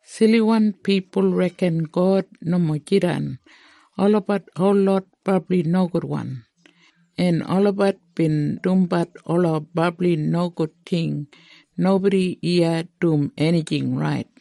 Siliwan pipul reken, “God nomo jidan!” Olabat holot brabli nogudwan, en olabat bin dumbat ola brabli nogud ting. Nobodi iya dum enijing rait.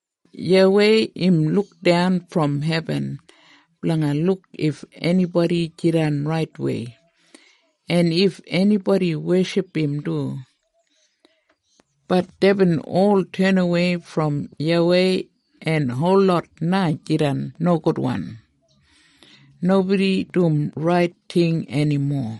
YAWEI im lukdan brom hebin blanga luk if enibodi jidan raitwei, en if enibodi weship im du. Bat deibin ol tenawei brom YAWEI, en holot na jidan nogudwan. Nobodi dum rait ting enimo.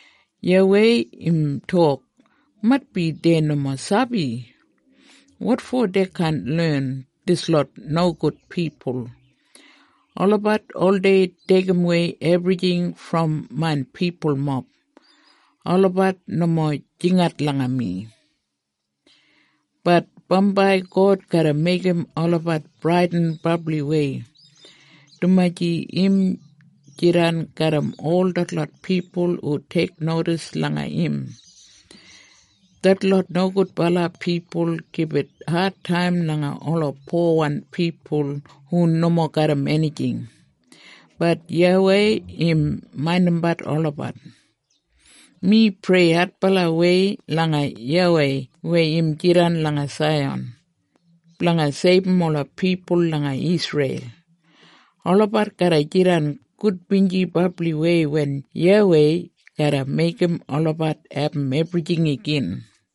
YAWEI im tok, “Maitbi dei nomo sabi. Wotfo dei kaan len, dislot nogud pipul? Olabat oldei deigimwei ebrijing brom main pipulmob. Olabat nomo jingat langa mi.” Bat bambai God garra meigim olabat bradin brabliwei, dumaji im jidan garram ol detlot pipul hu teiknodis langa im. Detlot nogudbala pipul gibit adtaim langa ola powan pipul hu nomo garram enijing, bat YAWEI im maindimbat olabat. Mi prei adbalawei langa YAWEI weya im jidan langa Saiyan, blanga seibum ola pipul langa Isreil. Olabat garra jidan gudbinji brabliwei wen YAWEI garra meigim olabat abum ebrijing igin.